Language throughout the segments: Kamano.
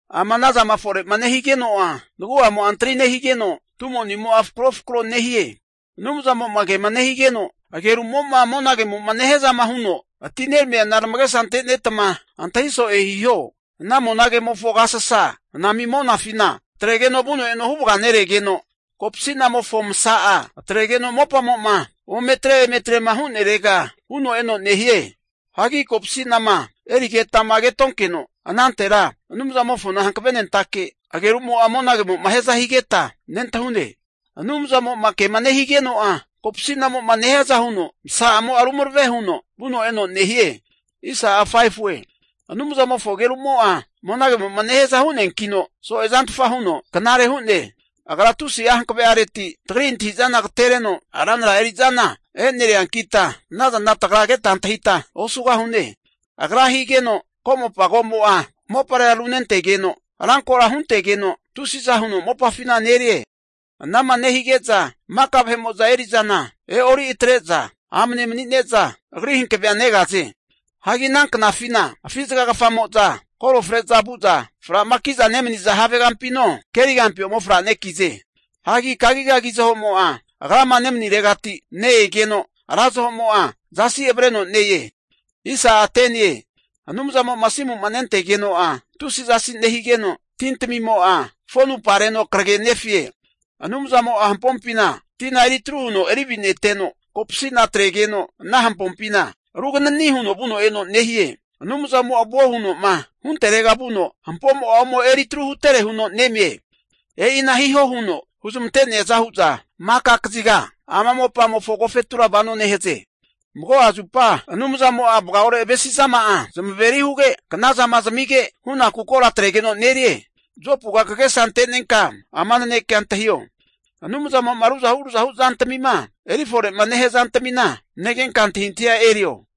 Ama anazama fore'ma nehigeno'a nagu'amo'a antari nehigeno, tumo'nimo'a fakrofakro nehie. Anumzamo'ma kema nehigeno agerumo'ma monagemo'ma nehiazama huno atineramiana tamagesa ante'netma antahi so'e hiho. Ana monagemofo agasasa anami monafina atregeno vuno eno huvaga neregeno, kopasi'namofo masa'a atregeno mopamo'ma umetre eme atrema hu'nerega vuno eno nehie. Hagi kopasi'nama erigetama ketonkeno anantera, Anumzamofona hankavenentake agerumo'a monagemo'ma hiaza higeta nentahune. Anumzamo'ma kema nehigeno'a, kopasi'namo'ma nehiaza huno masa'amo'a rumarave huno vuno eno nehie. Anumzamofo agerumo'a monagemo'ma nehiaza hu'neankino, so'e zantfa huno knare hu'ne. Agra tusi'a hankave'areti, tagri antahi'zana agatereno ranra eri'zana e'neriankita, anazana tagra keta antahita osugahune. Agra higeno ko'mopa komo'a moparera runentegeno, rankora huntegeno tusiza huno mopafina nerie Ana'ma nehige'za maka vahe'mo'za eri'zana e'ori atre'za amne mani'ne'za, Agri hankave'a negaze. Hagi ana knafina afi zagagafamo'za koro fre'za vu'za, fra'makiza nemaniza havegampino, kerigampi ome fra'nekize. Hagi kagigagi zahomo'a agrama nemaniregati ne-egeno, ra zahomo'a zasi avareno ne-e. Anumzamo'ma asimu'ma nentegeno'a tusi zasi nehigeno, tintamimo'a fonupareno kragenefe. Anumzamo'a hampompina tina eri atru huno erivineteno, kopasi'na atregeno ana hampompina ruganani huno vuno eno nehie. Anumzamo'a vuo huno'ma hunterega vuno hampomo'a ome eri tru hutere huno neme. E'ina hihoma huno huzmanteaza hu'za maka kaziga ama mopamofo agofetura vano nehaze. Mago'a zupa Anumzamo'a vagaore avesizama'a zamaveri huge knazama zamige, hunaku kora atregeno nerie. Jopuga kagesa ante'nenka ama nanekea antahio, Anumzamo'ma ruzahu ruzahu zantamima eri fore'ma nehia zantamina negenka antahintahia erio.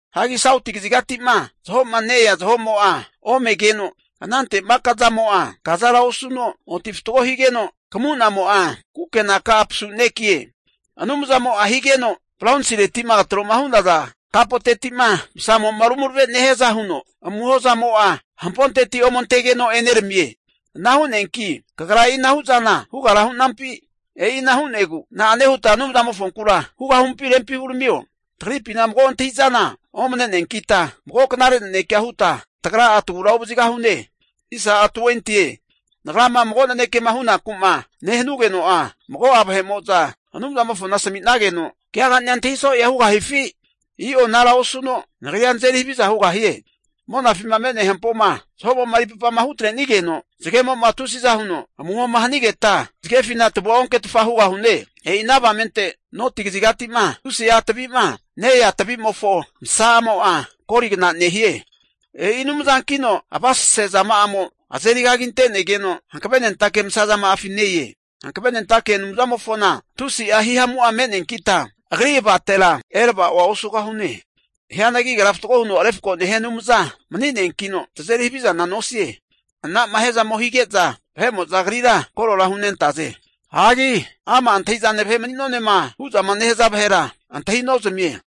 Hagi sauti kazigati'ma zaho'ma ne-ea zahomo'a omegeno, anante maka zamo'a kazara osuno oti fatgo higeno'a, kamu'namo'a kukenaka'a pasunekie. Anumzamo'a higeno bronsireti'ma tro'ma hu'naza kapoteti'ma masamo'ma rumarave nehiaza huno, amuho zamo'a hamponteti ome antegeno eneramie. Ana hu'neanki, kagra e'ina hu'zana hugara hu'nampi? E'ina hu'negu tagra na'ane huta Anumzamofonkura hugahumpi rempi huramio. Tagripina mago antahi'zana omane'neankita, mago knare nanekea huta tagra'a tagura ovazigahune. Nagrama mago nanekema hunaku'ma nehanugeno'a, mago'a Anumzamofona asami'nageno agesa ante'neno keagani'a antahi so'ea hugahifi? I'o anara osuno nagrira nazeri haviza hugahie. Monafima me'nea hampoma zahomo'ma eri papama hutrenigeno, zagemo'ma tusiza huno amuhoma hanigeta, zagefina tavua onketfa hugahune. E'ina avamente noti kazigati'ma tusi'a tavi'ma ne-ea tavimofo masa'amo'a goligna nehie. E'i Anumzankino avasase zama'amo azeri kaginte'negeno, hankavenentake masa zama'afi ne-e. Hankavenentake Anumzamofona tusi'a hihamu'a me'neankita, Agri avatera erava'oa osugahune. Hianagi Agra fatgo huno refko nehia Anumza mani'neankino, tazeri havizana nosie. Anama hiazamo hige'za vahe'mo'za Agrira koro hunentaze. Hagi ama' antahi'zane vahe mani'nonema hu'zama nehaza vahera antahi nozamie.